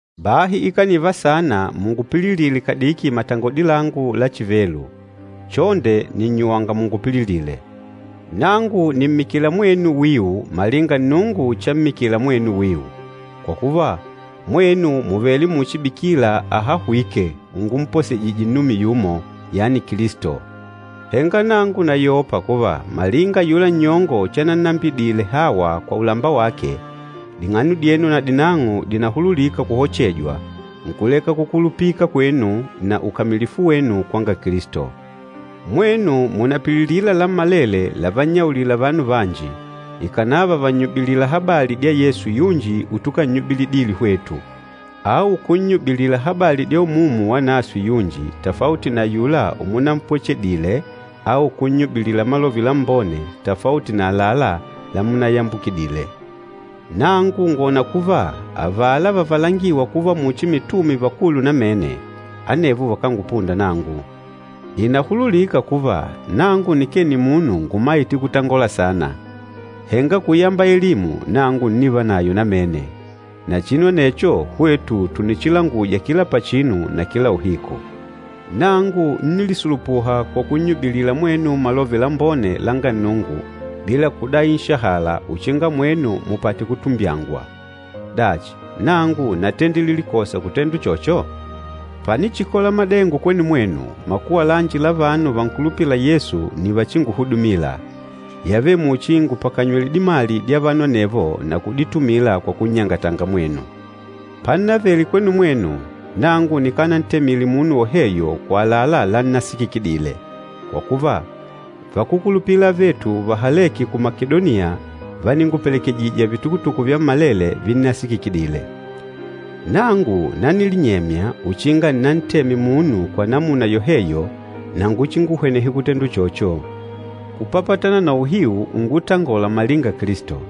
Bahi ikaniva saana mungupililile kadiki matangodi langu la chivelu! Chonde nìnnyuwanga mungupililile. Nangu nìmmikila mwenu wiu malinga Nnungu chammikila mwenu wiu. Kwa kuva, mwenu mùvele muchi bikila ahahwîke ungumposejije nnume yumo, yani Kilisto. Henga nangu nayopa kuva, malinga ayula nnyongo chanannambidile Hawa kwa ulamba wake, ding'ano dyenu nadinang'o dìnahululika kuhochejwa, nkuleka kukulupika kwenu na ukamilifu wenu kwanga Kilisto. Mwenu mùnapililila lammalele lavannyaulila vanu vanji, ikànava vànnyubilila habali dya Yesu yunji utukannyubilite hwetu, au kunnyubilila habali dya Umumu Wanaswe yunji tafauti na ayula umunampwechedile au kunnyubilila Malove Lambone tafauti na àlalá lamunayambukidile. Nangu ngwòna kuva avala vavalangîwa kuva muchi mitume vakulu namene, anevo vakángupunda nangu. Ìnahululika kuva nangu nikee nimunu ngumaîte kutangola saana, henga kuyamba elimu, nangu ǹnivanayo namene. Na chinu anecho, hwetu tùnichilanguja kila pachinu na kila uhiku. Nangu ńnilisulupuha kwa kunnyubilila mwenu Malove Lambone langa Nnungu bila kudai nshahala uchinga mwenu mupate kutumbyangwa. Dachi, nangu natendile likosa kutenda uchocho? Panichikola madengo kwenu mwenu, makuwa lanji la vanu vankulupîla Yesu nni vachinguhudumila. Yavele muchi ngùpakanywele dimali dya vanu anevo na kuditumila kwa kunnyangatanga mwenu. Pannavele kwenu mwenu, nangu nikanantemile munu woheyo kwa àlalá lannasikikidile, kwa kuva, vakúkulupila avetu vahalêke ku Makedoniya váningupelekejija vitukutuku vyammalele vinnasikikidile. Nangu nanilinyemya uchinga nnanteme munu kwa namuna yoheyo na nguchinguhwenehe kutenda uchocho. Kupapatana na uhiu ungutangola malinga Kilisto,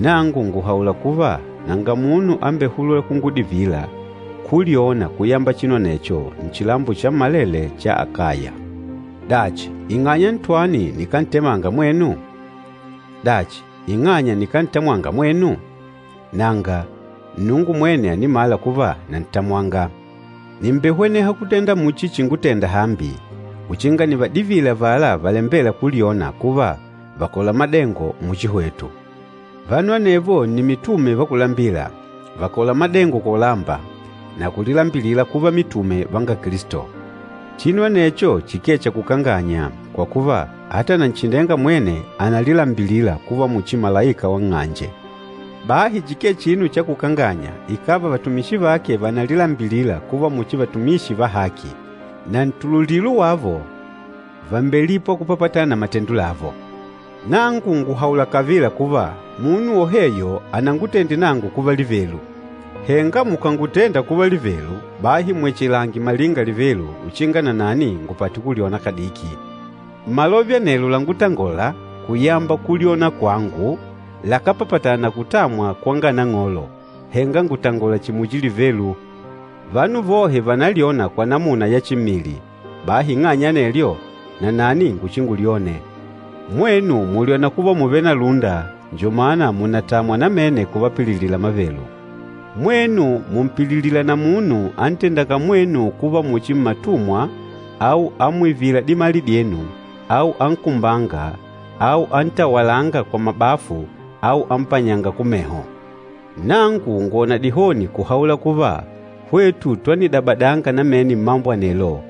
nangu ngùhaula kuva nanga munu ambehulûla kungudivila kulyona kuyamba chinu anecho, nchilambo chammalele cha Akaya. Dachi, ing'anya ntwani nikántemanga mwenu? Dachi, ing'anya nikántamwanga mwenu? Nanga, Nnungu mwene ànimala kuva nantamwanga. Nìmbehweneha kutenda muchi chingutenda hambi, uchinga nivadivile avala valembêla kulyona kuva, vàkola madengo muchi hwetu. Vanu anevo nni mitume va kulambila, vàkola madengo kwa ulamba, na kulilambilila kuva mitume vanga Kilisto. Chinu anecho chikee cha kukanganya, kwa kuva ata Nanchindenga mwene ànalilambilila kuva muchi malaika wa nng'anje. Bahi chikee chinu cha kukanganya ikàva vatumishi vake vànalilambilila kuva muchi vatumishi va haki. Na ntululilo wavo, vàmbelipwa kupapatana na matendo lavo. Nangu ngùhaula kavila kuva, munu woheyo anangutende nangu kuva livelu. Henga mukànutenda kuva livelu, bahi mwechelange malinga livelu uchinga nanani ngupate kulyona kadiki. Malove anelo lángutangòlà kuyamba kulyona kwangu lakápapatana na kutamwa kwanga Nang'olo, henga ngùtangola chihi muchi livelu. Vanu vohe vànalyona kwa namuna ya chimmili, bahi ing'anya ya anelyo, nanani nguchingulyone. Mwenu mùlyona kuva mùvele na lúnda, njo mana mùnatamwa namene kuvapililila mavelu! Mwenu mùmpililila na munu antendânga mwenu kuva muchi mmatumwa au amwivîla dimali dyenu au ankumbânga au antawalânga kwa mabafu au ampanyânga kumeho! Nangu ngwòna dihoni kuhaula kuva, hwetu twanidabadanga namene mmambo anelo,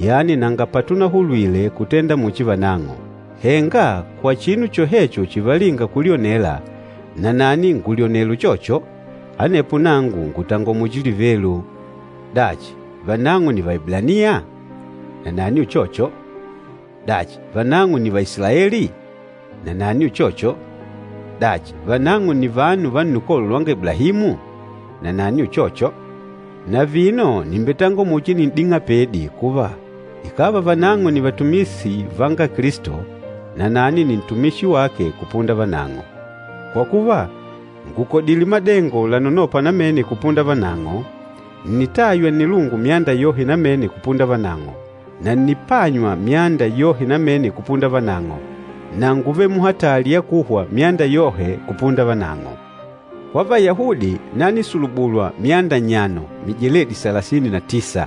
yani nanga patunahulwile kutenda muchi vanang'o! Henga kwa chinu chohecho chivalînga kulyonela, nanani ngulyonela uchocho. Anepo nangu ngùtangola muchi livelu. Dachi, vanang'o nni Vaeblaniya? Nanani uchocho. Dachi, vanang'o nni Vaisilaeli? Nanani uchocho. Dachi, vanang'o nni vanu va nnukolo lwanga Iblahimu? Nanani uchocho. Na vino nìmbetangola muchi nin'ding'apedi kuva, ikàva vanang'o nni vatumishi vanga Kilisto, nanani nni ntumishi wake kupunda vanang'o. Kwa kuva, ngùkodile madengo lanonôpa namene kupunda vanang'o, ǹnitaywa nnilungu myanda yohe namene kupunda vanang'o, na ǹnipanywa myanda yohe namene kupunda vanang'o, na ngúvele muhatali ya kuhwa myanda yohe kupunda vanang'o. Kwa Vayahudi, nanisulubulwa myanda nnyano, mijeledi salasini na tisa.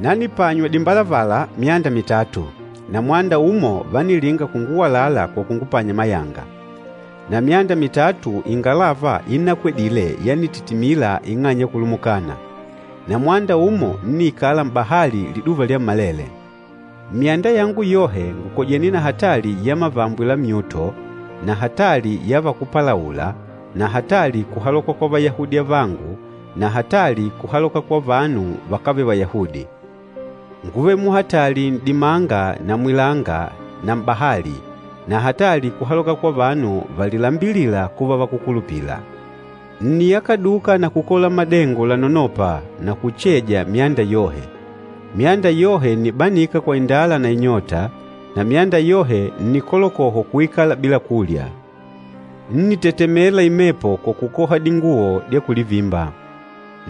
Nanipanywa dimbalavala myanda mitatu, na mwanda umo vánilinga kunguwalala kwa kungupanya mayanga. Na myanda mitatu, ingalava innakwedile yanititimila ing'anya ya kulumukana. Na mwanda umo, ńniikala m'bahali liduva lyammalele. Mmyanda yangu yohe ngùkojene na hatali ya mavambwe la myuto, na hatali ya vakúpalaula, na hatali kuhaloka kwa Vayahudi avangu na hatali kuhaloka kwa vanu vakávele Vayahudi. Ngúvele muhatali n'dimanga na mwilanga na m'bahali, na hatali kuhaloka kwa vanu valilambilîla kuva vakúkulupila. Ǹniyakaduka na kukola madengo lanonôpa, na kucheja myanda yohe. Myanda yohe ǹnibanika kwa indala na inyota, na myanda yohe ǹnikolokohwa kuikala bila kulya. Ńnitetemela imepo kwa kukoha dinguwo dya kulivimba.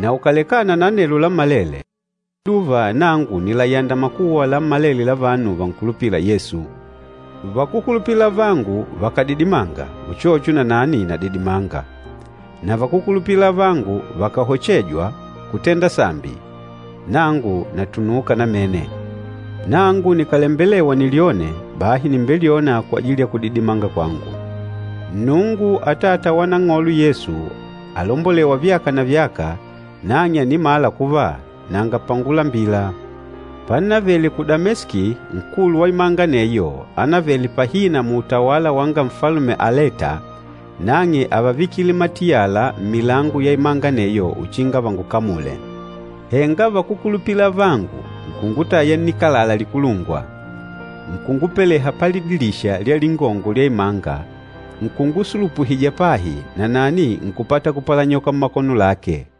Na ukàlekana na anelo lammalele, kila liduva nangu nìlayanda makuwa lammalele la vanu vankulupîla Yesu. Vakúkulupila avangu vakàdidimanga, uchocho nanani nadidimanga. Na vakúkulupila avangu vakàkohejwa kutenda sambi, nangu natunuuka namene. Nangu nikàlembelewa nilyone, bahi nìmbelyona kwajili ya kudidimanga kwangu. Nnungu, Atata wa Nang'olo Yesu, alombolêwa vyaka na vyaka, nang'e ànimala kuva nanga pangulambila. Pannavele ku Dameski, nkulu wa imanga aneyo, anavele pahina muutawala wanga Nfalume Aleta, nang'e ávavikile matiyala mmilango ya imanga aneyo uchinga vangukamule. Henga vakúkulupila avangu nkungutaya nnikalala likulungwa, nkungupeleha palidilisha lya lingongo lya imanga, nkungusulupuhija pahi, nanani nkùpata kupalanyoka mmakono lake.